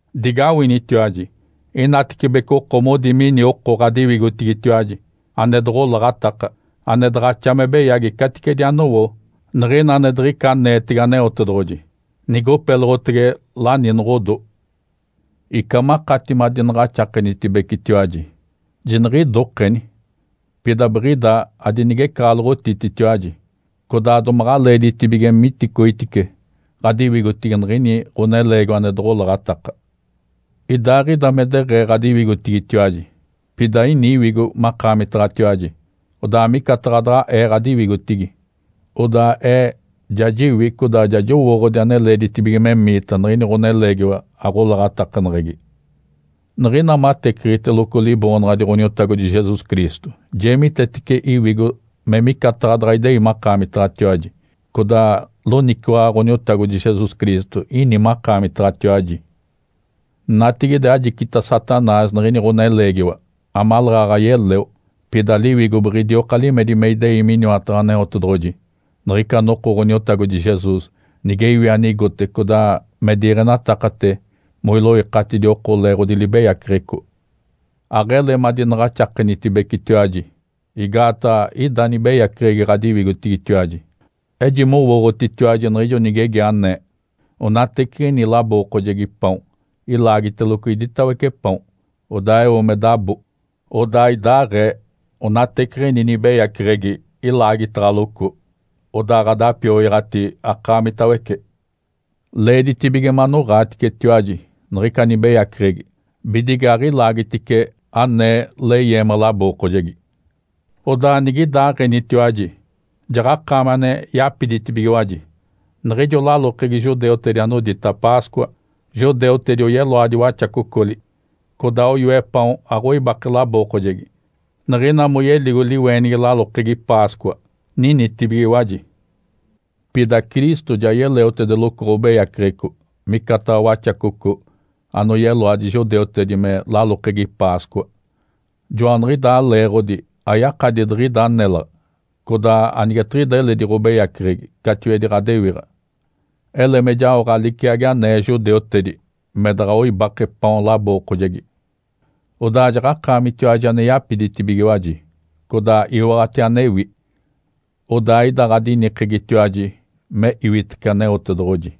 Digawinitiwaji! Inatecibece oko modi mini oko ɡ̶adiwigotigitiwaji ane doɡ̶olaɡ̶ataka ane daɡ̶axa me beyagi caticedi anowo niɡ̶ina ane diɡ̶ica aneetege Aneotedoɡ̶oji. Nigopeloɡ̶otege laninoɡ̶odo. Ica makati madinaɡ̶axakenitibecetiwaji, jiniɡ̶idokeni! Pida biɡ̶ida adinigecaɡ̶aloɡ̶otititiwaji, codaa domaɡ̶a leeditibige miticoitice ɡ̶adiwigotigi niɡ̶ini ɡ̶oneleegiwa ane doɡ̶olaɡ̶ataka. Idaaɡ̶ida me deɡ̶ee ɡ̶adiwigotigitiwaji, pida ini iwigo makaamitaɡ̶atiwaji, odaa micataɡ̶a daɡ̶a ee ɡ̶adiwigotigi, odaa ee ja jiwi codaa ja jowooɡ̶odi ane leeditibige memiita niɡ̶ini ɡ̶oneleegiwa aɡ̶olaɡ̶atakaneɡ̶egi. Niɡ̶ina mateciɡ̶iteloco Liboonaɡ̶adi Ǥoniotagodi Jesus Cristo, jeemitetece iwigo me micataɡ̶a daɡ̶a idei makaamitaɡ̶atiwaji, codaa loniciwaɡ̶a Ǥoniotagodi Jesus Cristo ini makaamitaɡ̶atiwaji. Natigide ajicita Satanás niɡ̶ini ɡ̶oneleegiwa, amaleeɡ̶aɡ̶a yeleo, pida liwigo biɡ̶idioka limedi me idei miniwataɡ̶a Aneotedoɡ̶oji niɡ̶ica noko Ǥoniotagodi Jesus, nige iwi anigote codaa me diiɡ̶enatakate moiloikatidi oko leeɡ̶odi libeyaceɡ̶eco. Aɡ̶ele madinaɡ̶axakenitibecetiwaji, igaataɡ̶a ida nibeyaceɡ̶egi ɡ̶adiwigotigitiwaji. Ejimowooɡ̶otitiwaji niɡ̶ijo nigegi anee, “Onateciɡ̶ini labookojegi paon ilaagiteloco iditawece paon, odaa eo me dabo.” Odaa idaaɡ̶ee onateciɡ̶ini nibeyaceɡ̶egi ilaagitaɡ̶aloco, odaa ɡ̶adapioyaɡ̶ati akaamitawece. Leeditibige manoɡ̶aaticetiwaji niɡ̶ica nibeyaceɡ̶egi, bidige aɡ̶ilaagitice anee leyeema labookojegi. Odaa nigidaaɡ̶enitiwaji, jaɡ̶akaami ane yapiditibigiwaji. Niɡ̶ijo lalokegi judeutedi anodita “Páscoa”, judeutedi oyeloadi waxacocoli, codaa oyoe paon aɡ̶oibake labookojegi. Niɡ̶ina moyeligo liweenigi lalokegi Páscoa, ninitibigiwaji. Pida Cristo ja yeleotedeloco ɡ̶obeyaceɡ̶eco, micataɡ̶a waxacoco, anoyeloadi judeutedi me lalokegi Páscoa. Joaniɡ̶idaa leeɡ̶odi ayakadi diɡ̶ida nélaɡ̶a, codaa anigetiɡ̶ida eledi ɡ̶obeyaceɡ̶egi catiwedi ɡ̶odewiɡ̶a, ele me jaoɡ̶a liciagi anee judeutedi me daɡ̶a oibake paon labookojegi. Odaa jaɡ̶akaamitiwaji ane yapiditibigiwaji, codaa iwaɡ̶ati anewi. Odaa ida ɡ̶adinikegitiwaji me iwitece Aneotedoɡ̶oji.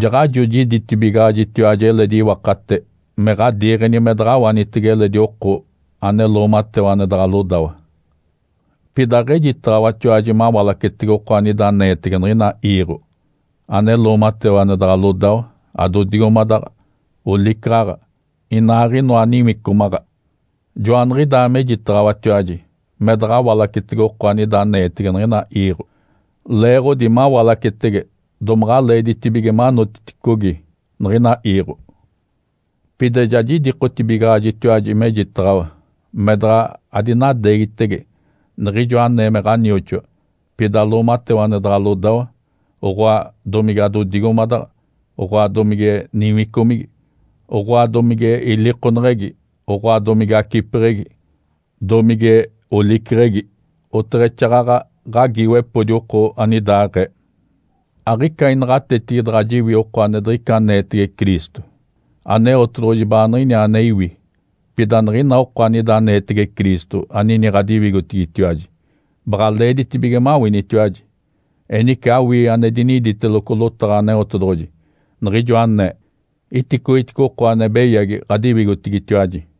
Jaɡ̶ajo jiditibigaɡ̶ajitiwaji eledi iwakate me ɡ̶adiiɡ̶eni me daɡ̶a awanitege eledi oko ane loomatewa ane daɡ̶a lodawa. Pida aɡ̶ejitaɡ̶awatiwaji mawalacetege oko anida aneetege niɡ̶ina iiɡ̶o, ane loomatewa ane daɡ̶a lodawa, adodigomadaɡ̶a, olicaɡ̶aɡ̶a, inaaɡ̶inoa niwicomaɡ̶a. Joaniɡ̶idaa mejitaɡ̶awatiwaji me daɡ̶a awalacetege oko anida aneetege niɡ̶ina iiɡ̶o, leeɡ̶odi mawalacetege domaɡ̶a leeditibige manotiticogi niɡ̶ina iiɡ̶o. Pida ja jidikotibigaɡ̶ajitiwaji mejitaɡ̶awa me daɡ̶a adinadeegitege niɡ̶ijo anee me ɡ̶anioxoa, pida loomatewa ane daɡ̶a lodawa, oɡ̶oa domige adodigomadaɡ̶a, oɡ̶oa domige niwicomigi, oɡ̶oa domige ilikoneɡ̶egi, oɡ̶oa domige acipeɡ̶egi, domige oliceɡ̶egi. Oteɡ̶exaaɡ̶aɡ̶a ɡ̶agiiwepodi oko anidaɡ̶aee. Aɡ̶ica inaɡ̶atetigi daɡ̶a jiwi oko ane diɡ̶ica aneetege Cristo. Aneotedoɡ̶oji baaniɡ̶iniaa ane iwi. Pida niɡ̶ina oko anida aneetege Cristo anini ɡ̶adiwigotigitiwaji baɡ̶a leeditibige mawinitiwaji. Enice awii ane diniditeloco lotaɡ̶a Aneotedoɡ̶oji, niɡ̶ijo anee, “Iticoitice oko ane beyagi ɡ̶adiwigotigitiwaji!”